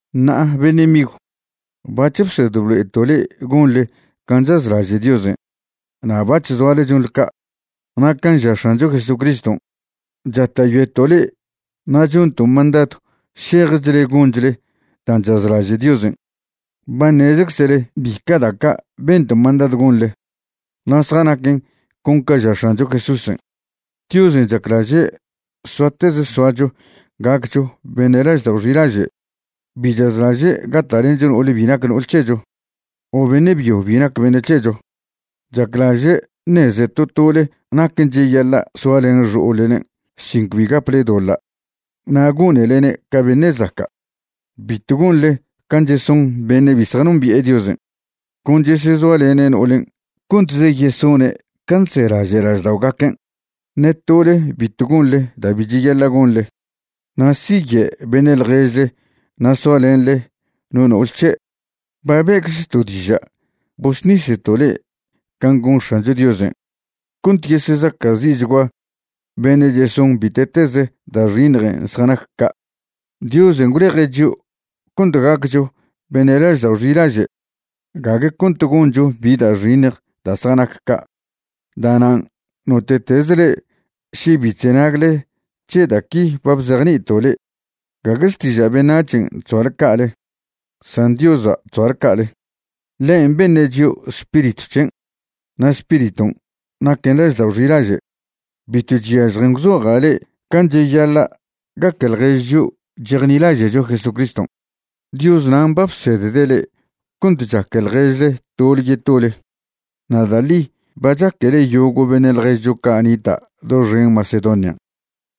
Ṉa'a beṉe' migw, bac̱h bsed blo'eto' le'e gonḻe can' chazlaže' Diosen', na' bac̱h zoale chonḻe ca'. Na' can' ža X̱ancho Jesucriston' chata'yoeto' le'e na' chonto' mandadw šejchle gonchle dan' chazlaže' Diosen'. Ba ṉezczele bica' da' ca' bento' mandadw gonḻe na' zjanaquen con ca ža X̱ancho Jesúsen'. Diosen' chaclaže' soatez soacho gaccho beṉe' laždao' xilaže'. Bi chazlaže' gata'lencho no'ol bi nac no'ol c̱hecho o beṉe' byo bi nac beṉe' c̱hecho. Chaclaže' ṉeze to tole naquen' cheyaḻa' soalen xo'ollen' sin cbi gaple doḻa' na' gonelene' ca beṉe' zaca'. Bitw gonḻe can' cheson beṉe' bi zjanombi'e Diosen', con chesezoalene' no'olen' contze yesone' can' chzelaže' lažda'ogaquen'. Ṉe tole bitw gonḻe da' bi cheyaḻa' gonḻe na' siye' beṉe' ḻježle na' soalenḻe no no'ol c̱he'. Ba be'czto' diža' bosṉiseto' le'e can' gon X̱ancho Diosen' cont yesezaca'zi'chgua beṉe' cheson bite'tez da' xiṉjen' zjanac ca'. Diosen' gwleje' chio' cont gaccho beṉe' laždao' xilaže', gague cont goncho bi da' xiṉj da' zjanac ca'. Da'nan' note'tez le'e še bi chzenagle c̱he da' qui ba bzejni'ito' le'e, gague xtiža' beṉac̱hen' chzoale ca'ale, san Diosa' chzoale ca'ale. Ḻen' beṉe' chio' Spiritw c̱hen' na' Spiriton' naquen laždao' xilaže'. Bitw chyažjen gwzoja' le'e can' cheyaḻa' gaque ḻjež chio' chejnilaže'cho Jesucriston'. Dios nan' ba bsedde' le'e cont chaque ḻježle tole yetole. Na' da' ḻi ba chaquele yogo' beṉe' ḻježcho ca' nita' doxen Macedonian'.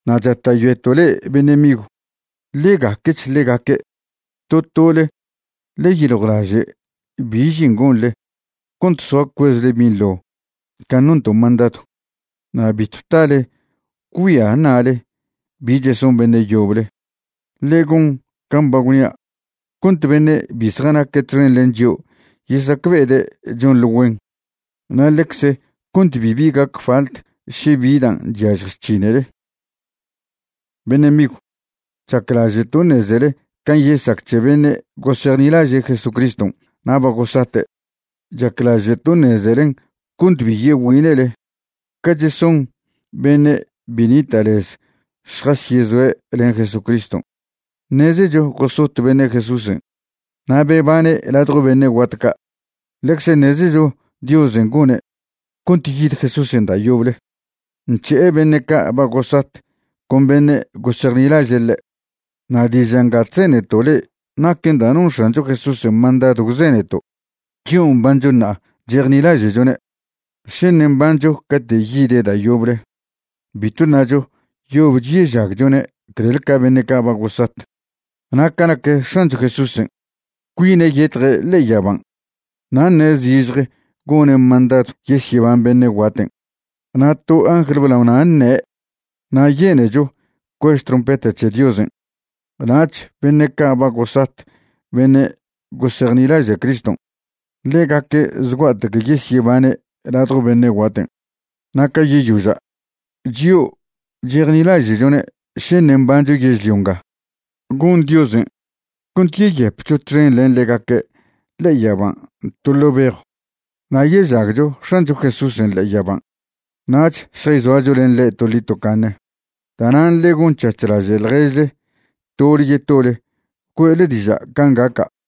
Na' chata'yoeto' le'e beṉe' migw, ḻe gaquech ḻegaque'. To tole ḻe yeyiljwlaže' bi žin gonḻe cont soa cuezle binḻo can' nonto' mandadw na' bitw tale gwgüia ṉa'le bi cheson beṉe' yoble. Ḻe gon can' ba gwnia' cont beṉe' bi zjanaque' txen len chio' yesacbe'ede' chonḻe güen, na' ḻecze cont bibi gac falt še bi dan' chyažj chc̱hinele. Beṉe' migw, chaclaže'to' ṉezele can' yesac c̱he beṉe' gosejnilaže' Jesucriston' na' ba gosate'. Chaclaže'to' ṉezelen cont bi yegüine'le ca cheson beṉe' bi nita' lez šjasyezoe' len Jesucriston'. Ṉezecho gosot beṉe' Jesúsen' na' bebane' ladjo beṉe' guat ca'. Ḻecze ṉezecho Diosen' gone' cont yid Jesúsen' da' yoble nc̱he'e beṉe' ca' ba gosat con beṉe' gosejnilaže' ḻe'. Na' diža' nga chzeneto' le'e naquen dan' non X̱ancho Jesúsen' mandadw gwzeneto'. Chio' mbancho ṉa'a chejnilaže'chone', še ṉe' mbancho cate' yide' da' yoble, bitw ṉacho yobch yežagchone' clel ca beṉe' ca' ba gosat. Na' ca nac X̱ancho Jesúsen', cuine' yetje' ḻe'e yaban', na' ṉe' zižje gone' mandadw yesyeban beṉe' guaten', na' to angl blaona' ṉe', na' yenecho cuež trompeta c̱he Diosen'. Nach beṉe' ca' ba gosat beṉe' gosejnilaže' Criston', ḻegaque' zgua'tec yesyebane' ladjo beṉe' guaten'. Na' ca yeyoža', chio' chejnilaže'chone' še ṉe' mbancho yežlio nga, gon Diosen' cont yeyepcho txen len ḻegaque' ḻe'e yaban' to ḻo' bejw na' yežagcho X̱ancho Jesúsen' ḻe'e yaban'. Nach šjayzoacho len ḻe' toḻi tocaṉe. Da'nan' ḻe gon c̱hac̱h laže' ḻježle tole yetole güe'le diža' can' gaca'.